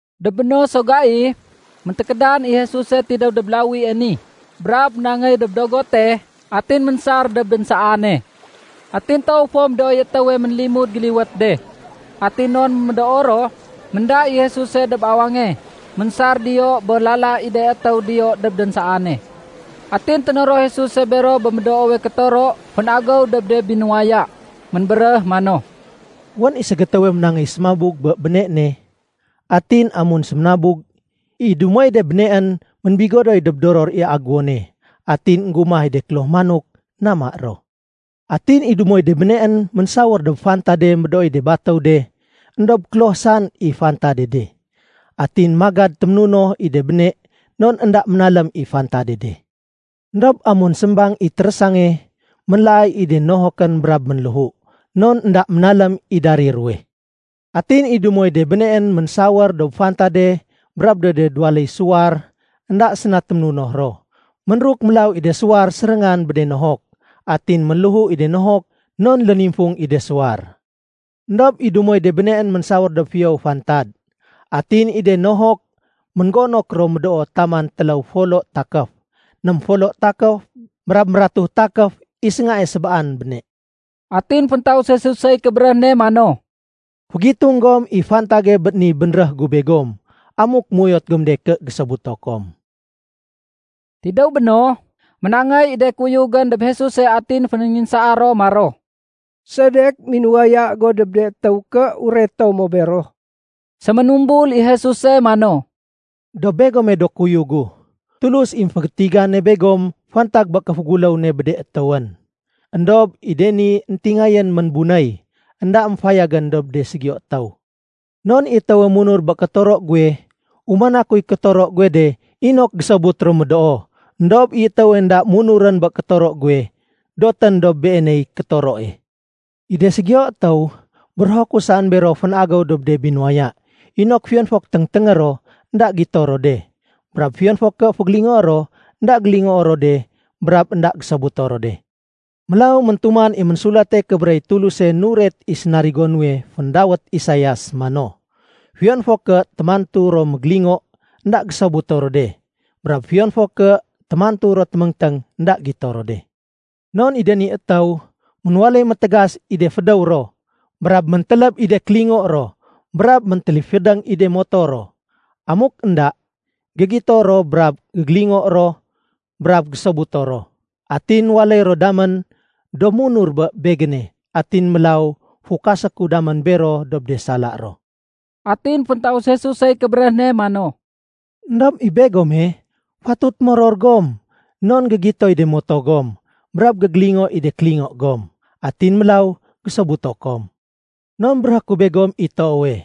Dob béno so gai, méntékédan i Jesuse tidéw dob lawie ni, brab ménangéy dob dogote atin ménsar dob dénsaane. Atin toow fo médooy étéwe ménlimud géliwét de. Atin non médoo ro, ménda i Jesuse dob awange ménsar diyo bé lala i de étéw diyo dob dénsaane. Atin ténoro Jesuse bero bé médoowe kétoro fén-agéw dob de binuwaya. Ménbéréh mano, “Wén i ségétéwe ménangéy sémabug bé béne ne. Atin amun sémanabug, i dumoy de béneén ménbigodoy dob doror i aguwone. Atin énggumah i de kloh manok nama ro. Atin i dumoy de béneén ménsawér dob fantade médooy de batéw de, éndob kloh saén i fantade de. Atin magad téménunoh i de béne non énda ménalém i fantade de. Endob amun sémbang i térésange, ménlaay i de nohokén brab ménléhu, non énda ménalém i darir ruwe. Atin i dumoy de béneén ménsawér dob fantade brab dob de duwaléy suwar énda séna témunoh ro. Ménruk mélaw i de suwar séréngan bé de nohok, atin ménléhu i de nohok non lénimfung i de suwar. Endob i dumoy de béneén ménsawér dob fiyowe fantad. Atin i de ni nohok ménggonok ro médoo taman téléw folo takéf, ném folo takéf, brab mératu takéf i séngae sébaan béne.” Atin féntaus Jesusey kébéréh ne mano, “Fégitung gom i fantage bé ni bénréh gu begom amuk méuyot gom de ké gésobuto kom.” Tidéw béno, ménangéy i de kuyugén dob Jesuse atin fénénginsaa ro maro, “Sedek minuwaya go dob de étéw ké ureto mo bero?” Séménumbul i Jesuse mano, “Dob begome do kuyug gu, Tulus i émfégétigane begom fantag bé kéféguléw ne bé de étéwén. Endob i de ni éntingayén ménbunéy, énda émfayagén dob de ségiyo étéw. Non i étéwe munur bé kétoro guwe, umana kuy kétoro guwe de inok gésobut ro médoo. Endob i étéwe énda munurén bé kétoro guwe, dotén dob beeney kétoroe. I de ségiyo étéw, bérého ku saén bero fén-agéw dob de binuwaya, inok fiyon fo ké téngténgé ro, énda gito ro de. Brab fiyon fo ké fégélingoé ro, énda gélingoo ro de brab énda gésobuto ro de. Mélaw méntuman i Ménsulate Kébéréh i Tuluse nuret i sénarigo nuwe féndawét Isaias mano, ‘Fiyon fo ké témantu ro mégélingo, énda gésobuto ro de, brab fiyon fo ké témantu ro téméngténg, énda gito ro de. Non i de ni étéw, ménwaléy métégas i de fédéw ro, brab méntéléb i de kélingo ro, brab méntéléfédéng i de moto ro. Amuk énda, gégito ro brab gégélingo ro brab gésobuto ro. Atin waléy ro damén do munur dob Begéne atin mélaw fukasé ku damén bero dob de sala ro.’” Atin féntaus Jesusey kébéréh ne mano, “Endob i begome, fatut moror gom, non gégitoy de moto gom brab gégélingo i de kélingo gom. Atin mélaw gésobuto kom. Non béréhé ku begom i toowe,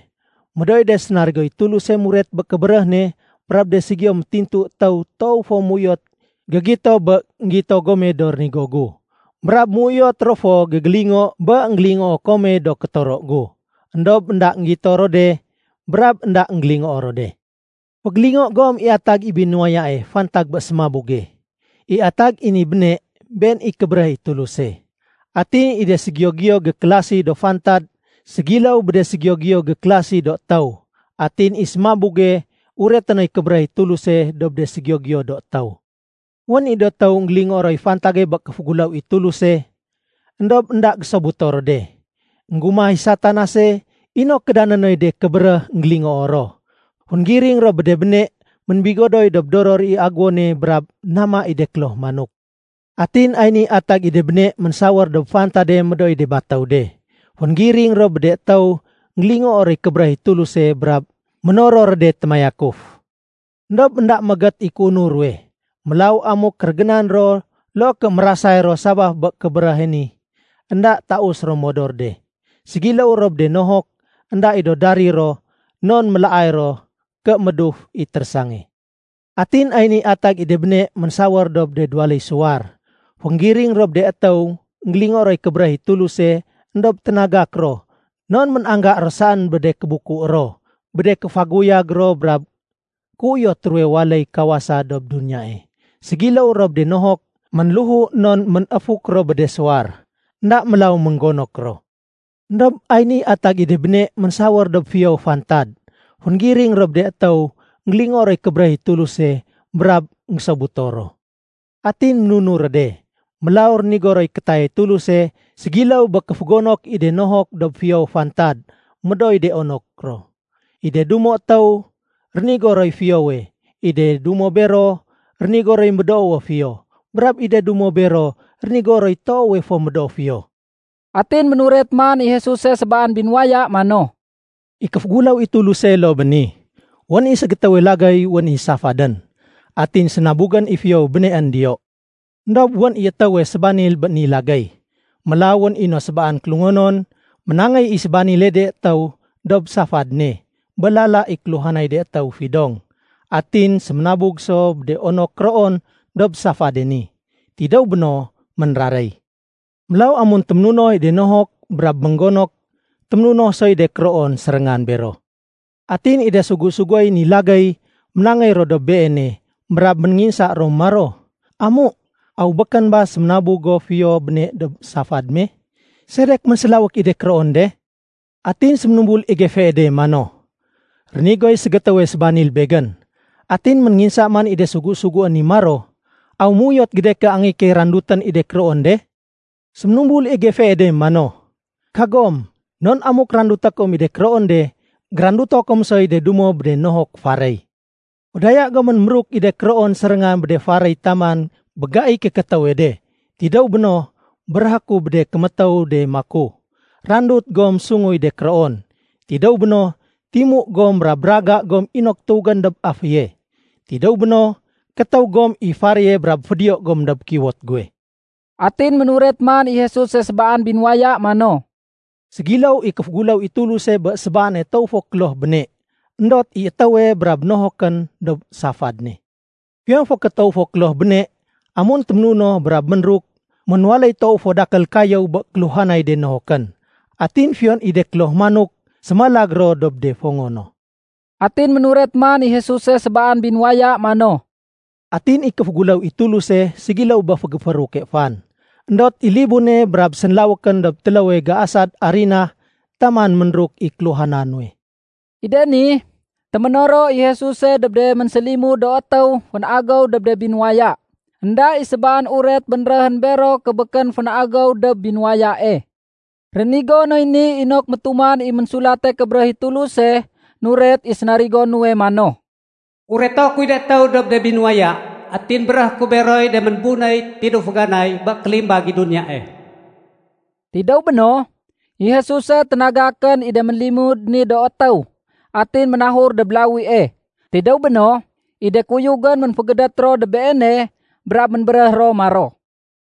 médooy de sénarigoy Tuluse muret bé kébéréh ne brab de ségiyo métintu étéw toow fo ménuyot gégito bé énggito gome do rénigo gu. Brab ménuyot ro fo gégélingo bé énggélingoo kome do kétoro gu. Endob énda énggito ro de brab énda énggélingoo ro de. “Fégélingo gom i atag i binuwayae fantag bé sémabuge. I atag i ni béne, been i kébéréh i Tuluse. Atin i de ségiyo-giyo gékélasi do fantad ségiléw bé de ségiyo-giyo gékélasi do étéw. Atin i sémabuge ureté noy kébéréh i Tuluse dob de ségiyo-giyo do étéw. “Wén i do étéw énggélingoo roy fantage bé kéféguléw i Tuluse, éndob énda gésobuto ro de. Enggumah i Satanase inok kédané noy de kébéréh énggélingoo ro. Fénggiring ro bé de béne ménbigodoy dob doror i aguwone brab nama i de kloh manok. Atin ay ni atag i de béne ménsawér dob fantade médooy de batéw de. Fénggiring ro bé de étéw énggélingoo roy kébéréh i Tuluse brab ménoror ro de témayakuf. Endob énda méégét i kéunur ruwe. Mélaw amuk kérégénan ro loo ké mérasay ro sabaf bé kébéréhe ni, énda taus ro modor de. Ségiléw ro bé de nohok énda i do darir ro, non mélaay ro ké méduf i térésange. Atin ay niy atag i de béne ménsawér dob de duwaléy suwar. Fénggiring ro bé de étéw énggélingoo roy kébéréh i Tuluse éndob ténagak ro non ménangga ro saén bé de kébuku ro bé de kéfaguyag ro brab kéuyot ruwe waléy kawasa dob ni duniya. Ségiléw ro bé de nohok ménléhu non ménéfuk ro bé de suwar. Enda mélaw ménggonok ro. Endob ay niy atag i de béne ménsawér dob fiyowe fantad. Fénggiring ro bé de étéw énggélingoo roy kébéréh i Tuluse brab énggésobuto ro. Atin munur ro de, mélaw rénigo roy kétayay Tuluse ségiléw bé kéfégonok i de nohok dob fiyowe fantad médooy de onok ro. I de dumo étéw rénigo roy fiyowe, i de dumo bero rénigo roy médoowe fiyo, brab i de dumo bero rénigo roy toowe fo médoo fiyo.” Atin ménuret man i Jesuse sébaan binuwaya mano, “I kéféguléw i Tuluse loo bé ni. Wén i ségétéwe lagéy wén i safadén. Atin sénabugén i fiyowe béneén diyo. Endob wén i étéwe sébanil bé ni lagéy. Mélaw wén i no sébaan kélungonon, ménangéy i sébanile de étéw dob safad ne bé lala i kéluhanay de étéw fidong. Atin séménabug so do onok kéroon dob safade ni. Tidéw béno, ménraréy. Mélaw amun téménunoh i de nohok brab ménggonok téménunoh soy de kéroon séréngan bero. Atin i de sugu-suguéy ni lagéy ménangéy ro dob beene brab ménénginsa ro maro, ‘Amu, aw békén ba séménabug go fiyo béne dob safad me? Sedek ménsélawék i de kéroon de?’ Atin séménumbul i gefee de mano, ‘Rénigoy ségétéwe sébanil begén.’ Atin ménénginsa man i de sugu-suguén ni maro, ‘Aw méuyot go de ké angéyé key randutén i de kéroon de?’ Séménumbul i gefee de mano, ‘Kagom. Non amuk randuté kom i de kéroon de, géranduto kom soy de dumo bé de nohok faréy. Fédaya gomén méruk i de kéroon séréngan bé de faréy taman bé gaiy kékétéwe de. Tidéw béno, béréhé ku bé de kémétéw de maku, Randut gom sunguy de kéroon. Tidéw béno, timu gom brab raga gom inok tuwégén dob aféye. Tidéw béno, kétéw gom i faréye brab fédiyo gom dob kiwot guwe.’” Atin ménuret man i Jesuse sébaan binuwaya mano, “Ségiléw i kéféguléw i Tuluse bé sébaane toow fo kloh béne, éndot i étéwe brab nohokén dob safad ne. Fiyon fo ké toow fo kloh béne, amun téménunoh brab ménruk, ménwaléy toow fo dakél kayéw bé kéluhanay de nohokén. Atin fiyon i de kloh manok sémalag ro dob de fongo no.” Atin ménuret man i Jesuse sébaan binuwaya mano, “Atin i kéféguléw i Tuluse ségiléw bé fégéfééruke fan. Endot i libune brab sénlawékén dob téléwe géasad arinah taman ménruk i kéluhana nuwe.” I de ni, téménoro i Jesuse dob de ménsélimud do étéw fén-agéw dob de binuwaya. Enda i sébaan uret bénréhén bero ké békén fén-agéw dob binuwayae. Rénigo noy ni inok métuman i Ménsulate Kébéréh i Tuluse nuret i sénarigo nuwe mano, “Ureto kuy de étéw dob de binuwaya. Atin béréhé ku beroy de ménbunéy tidéw féganay bé kélimbag i duniyae.” Tidéw béno, i Jesuse ténagakén i de ménlimud ni do étéw atin ménahur dob lawie. Tidéw béno, i de kuyugén ménfégédét ro dob Beene brab ménbéréh ro maro,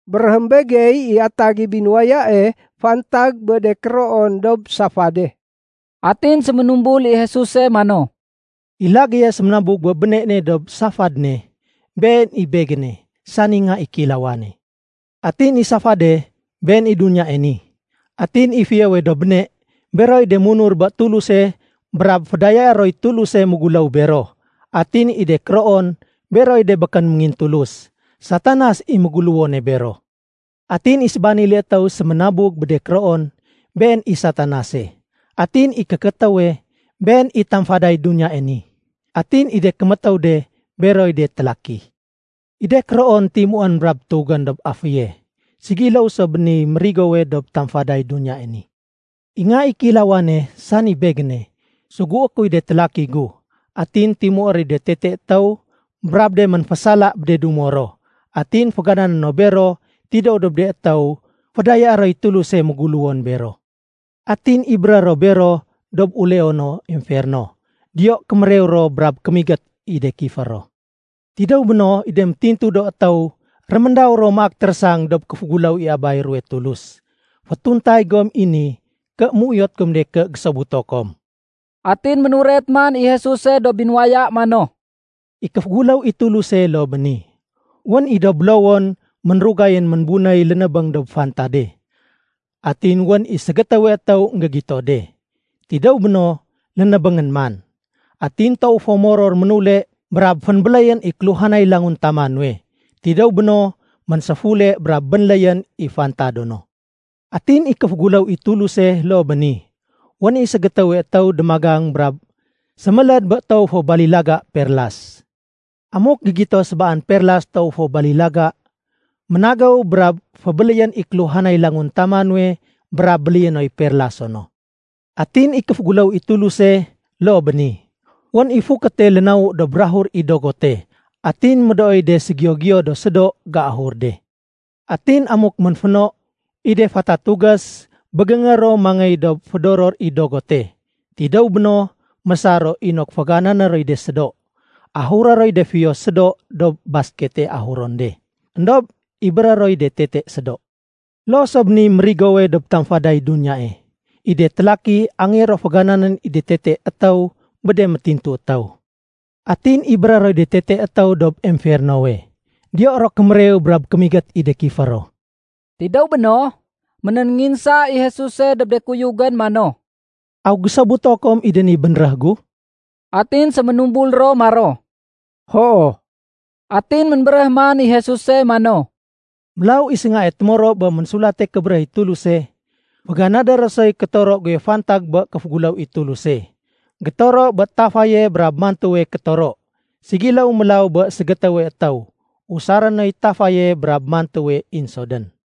“Béréhém begey i atag i binuwayae fantag bé de kéroon dob safade.” Atin séménumbul i Jesuse mano, “I lagéye séménabug bé béne ne dob safad ne, been i Begéne, sani Nga i Kéilawane. Atin i safade, been i duniyae ni. Atin i fiyowe do béne, beroy de munur bé Tuluse brab fédayaé roy Tuluse méguléw bero. Atin i de kéroon, beroy de békén méngintulus. Satanas i méguléwone bero. Atin i sébanile étéw séménabug bé de kéroon, been i Satanase. Atin i kékétéwe, been i tamfaday duniyae ni. Atin i de kémétéw de, beroy de télaki. I de kéroon timuén brab tuwégén dob aféye. Ségiléw so bé niy mérigowe dob tamfaday duniyae ni. I Nga i Kéilawane, sani Begéne, sugué kuy de télaki gu. Atin timué roy de tete étéw brab de ménfésala bé de dumo ro. Atin féganané no bero tidéw dob de étéw fédayaé roy Tuluse méguléwon bero. Atin ibéré ro bero dob uleono emferno. Diyo kémérew ro brab kémigét i de kifé ro. Tidéw béno, i de métintu do étéw réméndaw ro maak térésang dob kéféguléw i Abay ruwe Tulus. Fétuntay gom i ni ké méuyot gom de ké gésobuto kom.” Atin ménuret man i Jesuse do binuwaya mano, “I kéféguléw i Tuluse loo bé ni. Wén i do bélowon ménrugayén ménbunéy lénébéng dob fantade. Atin wén i ségétéwe étéw énggégito de. Tidéw béno, lénébéngén man. Atin toow fo moror, ménule brab fénbéléyén i kéluhanay languntama nuwe. Tidéw béno, ménséfule brab bénléyén i fantado no. “Atin i kéféguléw i Tuluse loo bé ni. Wén i ségétéwe étéw démagang brab séméléd bé toowe fo balilaga perias. Amuk gégito sébaan perlas toow fo balilaga, ménagéw brab fébéléyén i kéluhanay languntama nuwe brab béléyé noy perlaso no. “Atin i kéféguléw i Tuluse loo bé ni. Wén i fukéte lénawu dob bukag i dogote. Atin médooy de séségiyo-giyo do sédo géahur de. Atin amuk ménféno, i de fatatugés bégéngé ro mangéy dob fédoror i dogote. Tidéw béno, mésar ro inok féganané roy de sédo. Ahuré roy de fiyo sédo dob baskete ahuron de. Endob ibéré roy de tete sédo. Loo so bé niy mérigowe dob tamfaday duniyae. I de télaki angéyé ro fégananén i de tete étéw bé de métintu étéw. Atin ibéré roy de tete étéw dob emfernowe. Diyo ro kémérew brab kémigét i de kifé ro.” Tidéw béno, ménénginsa i Jesuse dob de kuyugén mano, “Aw gésobuto kom i de ni bénréh gu?” Atin séménumbul ro maro, “Hoo.” Atin ménbéréh man i Jesuse mano, “Mélaw i séngae témoro bé Ménsulate Kébéréh i Tuluse, féganadé ro soy kétoro guwe fantag bé kéféguléw i Tuluse, gétoro bé tafaye brab mantuwe kétoro. Ségiléw mélaw bé ségétéwe étéw usaré noy tafaye brab mantuwe insodén.”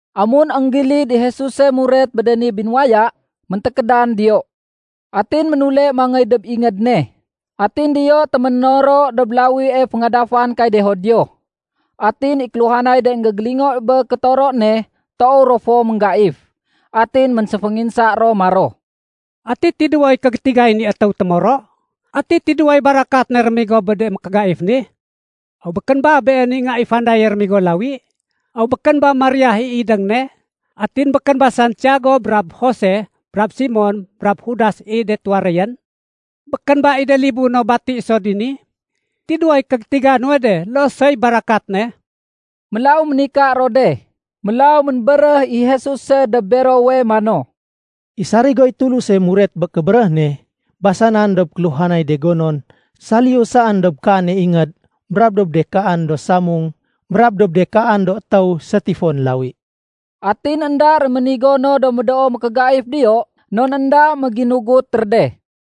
Amun énggilid i Jesuse muret bé de ni binuwaya, méntékédan diyo. Atin ménule mangéy dob ingéd ne. Atin diyo téménoro dob lawie féngadafan kay de Judio. Atin i kéluhanay de énggégélingo bé kétoro ne toow ro fo ménggaif. Atin ménséfénginsa ro maro, “Ati tidéwoy kégétigay ni étéw témoro? Ati tidéwoy barakat ne rémigo bé de mékégaif ni? Aw békén ba, Been i Nga i fandaye rémigo lawi? Aw békén ba Maria i idéng ne? Atin békén ba Santiago brab Jose brab Simon brab Judas i de tuwaréyén? Békén ba i de libu no bati so dini? Tidéwoy kégétiga nuwe de, loo soy barakat ne?” Mélaw ménika ro de. Mélaw ménbéréh i Jesuse dob berowe mano, “I sarigoy Tuluse muret bé kébéréh ne, basanan dob kéluhanay de gonon saliyu saén dob kaane ingéd brab dob de kaan do samung brab dob de kaan do étéw sétifon lawi.” Atin énda réménigo no do médoo mékégaif diyo non énda méginugut ro de.